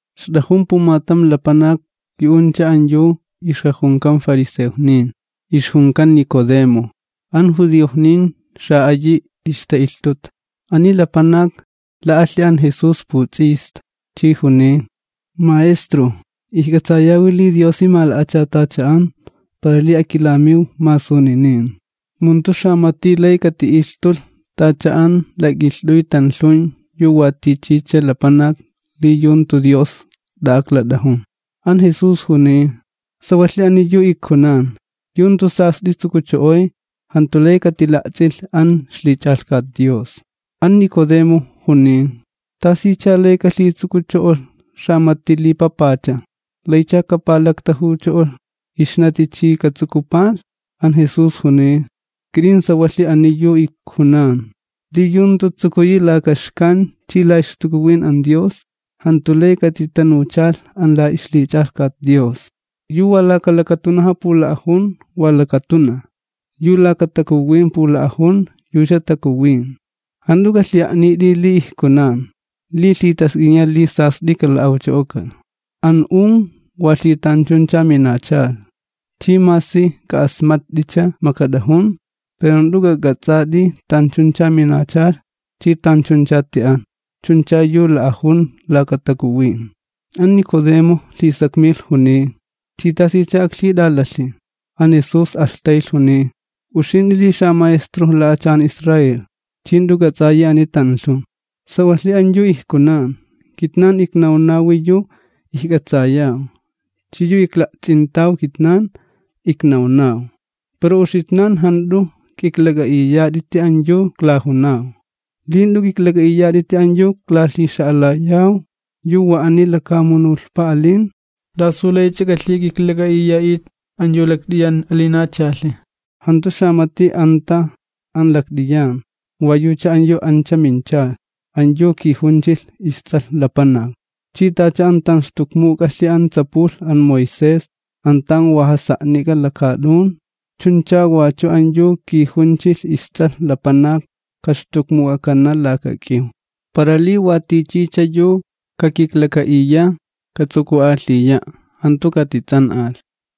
Ixt'ajun pumatam lapanak yu'uncha an yu ixjajunkan fariseojnin, ixjunkan Nicodemo, an judiojnin xa'ayi ixta'ilhtuta. Ani lapanak la'alhi an Jesús puts'ista, chi juniy: ―Maestro, ijk'atsayawi li Diosi mala'achatacha'an para li akilamiw masuninin, mu jantu xamati lay kati'ilhtulh t'ach'a an lak'ilht'uy tanlhun yu wa tichicha lapanak, li yu jantu Dios t'a'aklat'ajun. An Jesús juniy: ―Sawalhi ani yu ijkunan, yu jantu sast'i tsukucho'oy jantu lay katila'ts'ilh an ixlich'alhkat Dios. An Nicodemo juniy: ―¿Tasicha lay kalhitsukucho'olh xamati li papacha? ¿Laycha kapalaktajucho'olh ixnati chi katsukupalh? An Jesús juniy: ―Kit'in sawalhi ani yu ijkunan, li yu jantu tsukuyi laka xkan chi la ixTakuwin an Dios, jantu lay katitanuchalh an la ixlich'alhkat Dios. Yu wa laka lakatunaja pula'ajun, wa lakatunaj, yu laka Takuwin pula'ajun, yucha takuwin. Jant'u k'alhi'a'nit'i li ijkunan: “Li lhitask'iniya li sast'i kala'awcho'okalh.” An un wa lhitanchuncha minachalh, chi masi k'a'asmatt'i makat'ajun, pero jant'u k'ak'ats'ati tanchuncha minachalh chi tanchuncha ti'an. Chuncha yu la'ajun laka Takuwin. An Nicodemo lhisakmilh juniy: ―¿Chi tasicha aklhit'alalhi? An Jesús alhtaylh juniy: ―Uxint'i li ixmaestrojk'an xalapanakni Israel, ¿ch'i jant'u k'ats'ayi ani tanlhun? Sawalhi an yu ijkunan, kitnan iknawnaw yu ijk'atsayaw chi yu ikla'ts'intaw. Pero uxitnan jant'u k'iklak'a'iyat'iti an yu iklajunaw. Li jant'u k'iklak'a'iyat'iti an yu iklalhixa'alayaw yu wa ani lakamunulhpa alin, ¿t'asu laych'a k'alhik'iklak'a'iya'it an yu lakt'iyan alinachalhi? ’Jantu xamati anta an lakt'iyan, wa yucha an yu ancha minchalh, an yu kijunchilh isTs'alh Lapanak. Chi tacha an tanxtukmuk'alh an tsapulh an Moisés an tan wa jasa'nik'a lakaat'un, chuncha wachu an yu kijunchilh isTs'alh Lapanak kaxtukmuk'akana laka k'iw. Para li wa tichicha yu kakiklaka'iya, katsuku'alhiya', jantu katits'an'alh.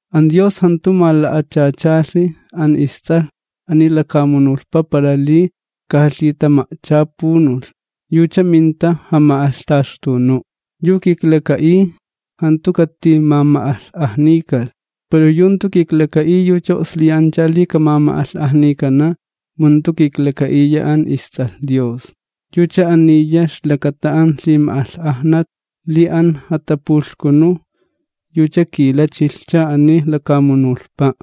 An Dios jantu mala'achachalh an isTs'alh ani lakamunulhpa para li kamilh jalhitama'chapunu', yucha minta jama'alhtaxtunu'. ’Yu kiklaka'iy jantu katimama'alh'ajnikalh, pero yu jantu kiklaka'iy yucha o'sliyancha li kamama'alh'ajnikana', mu jantu kiklaka'iya an isTs'alh Dios. Yucha aniya ixlakata an lhima'alh'ajnat, li an jatapulhkunu yucha kilachilhcha ani lakamunulhpa',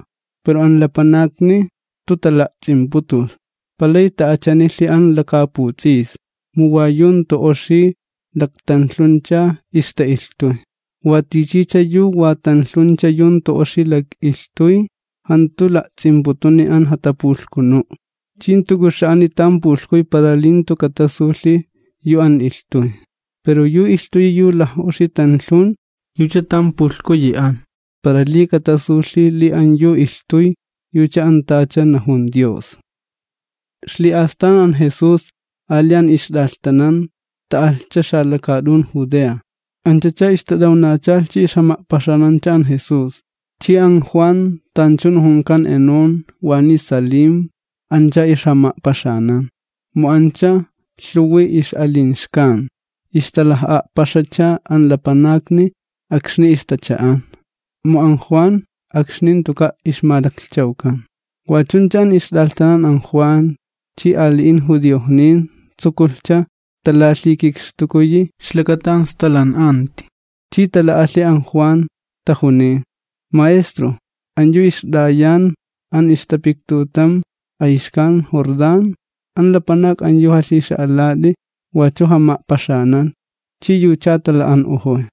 pero an lapanakni jantu tala'ts'imputulh, palay ta'achanilhi an lakaputs'isni, mu wa yu jantu oxi laktanlhuncha ixta'ilhtuy. Watichicha yu wa tanlhuncha yu jantu oxi lak'ilhtuy, jantu la'ts'imputuni an jatapulhkunu', chi jantu k'uxa'ani tan pulhkuy para li jantu katasulhi yu an ilhtuy. Pero yu ilhtuyi yu laj'oxi tanlhun yucha tan pulhkuyi an, para li katasulhi li an yu ilhtuy yucha an tacha najun Dios. Ixli'astan an Jesús ali an ixt'alhtanan ta'alhcha xalakaat'un Judea, anchacha ixtat'awnachalh chi ixjama'paxanancha an Jesús. Chi an Juan, tanchun junkan Enón waniy Salim ancha ixjama'paxanan, mu ancha lhuwi ix'alin xkan. Ixtalaj'a'paxacha an lapanakni akxni ixtacha'an, mu an Juan akxni jantuka' ixmalaklhchawkan. Wa chuncha an ixt'alhtanan an Juan chi ali'in judiojnin tsukulhcha talalhikikxtukuyi ixlakata an stalan'anti. Chi tala'alhi an Juan, tajuniy: ―Maestro, an yu ixt'ayan an ixtapiktutam ayxkan Jordán, an lapanak an yu jalhixa'alat'i, wachu jama'paxanan, chi yucha tala'an'ojoy.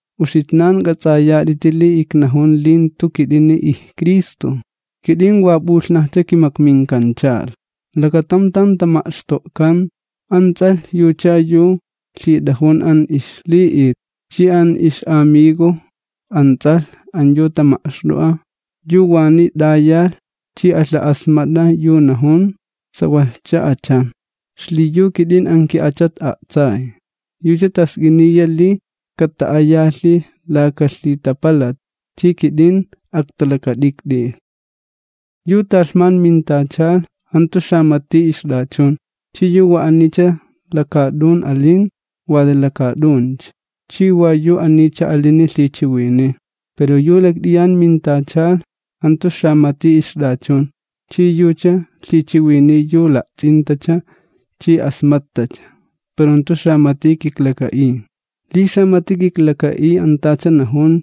Uxitnan k'ats'ayat'iti li iknajun li jantu kit'ini ijCristo, kit'in wa p'ulhnajcha kimakminkanchalh. Lakatam tan tama'xto'kan, an ts'alh yucha yu lhit'ajun an ixli'it, chi an ix'amigo an ts'alh an yu tama'xt'o'a, yu waniy t'ayalh chi alha'asmat'a yu najun, sawalhcha achan. Xliyu kit'in an ki'achat a'tsay. Yucha task'iniya li kata'ayalhi laka lhitapalat, chi kit'in aktalakat'ikt'ilh. ’Yu talhman mintachalh jantu xamati ixt'achun. Chi yu wa anicha lakaat'un alin wa xanawincha lakaat'un, chi wa yu anicha alini lhichiwiniy. Pero yu lakt'iyan mintachalh jantu xamati ixt'achun, chi yucha lhichiwiniy yu la'ts'intacha chi asmattacha, pero jantu xamati kiklaka'iy. Li xamati kiklaka'iy an tacha najun,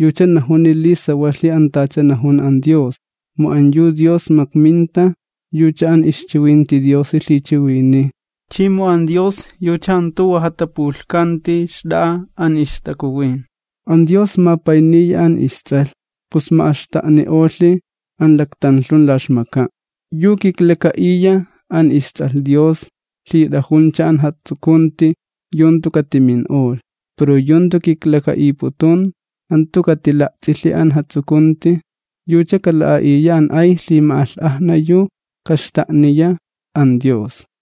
yucha najuni li sawalhi an tacha najun an Dios. Mu an yu Dios makminta, yucha an ixchiwinti Diosi lhichiwiniy, chi mu an Dios yucha jantu wa jatapulhkanti xt'a'a an ixTakuwin. An Dios mapayniya an isTs'alh, pus ma'axta'ni'olhi an laktanlhun la ixmaka'. Yu kiklaka'iya an isTs'alh Dios lhit'ajuncha an jatsukunti yu jantu katimin'olh. Pero yu jantu kiklaka'iputun jantu katila'ts'ilhi an jatsukunti, yucha kala'a'iya an ay lhima'alh'ajna yu kaxta'niya an Dios.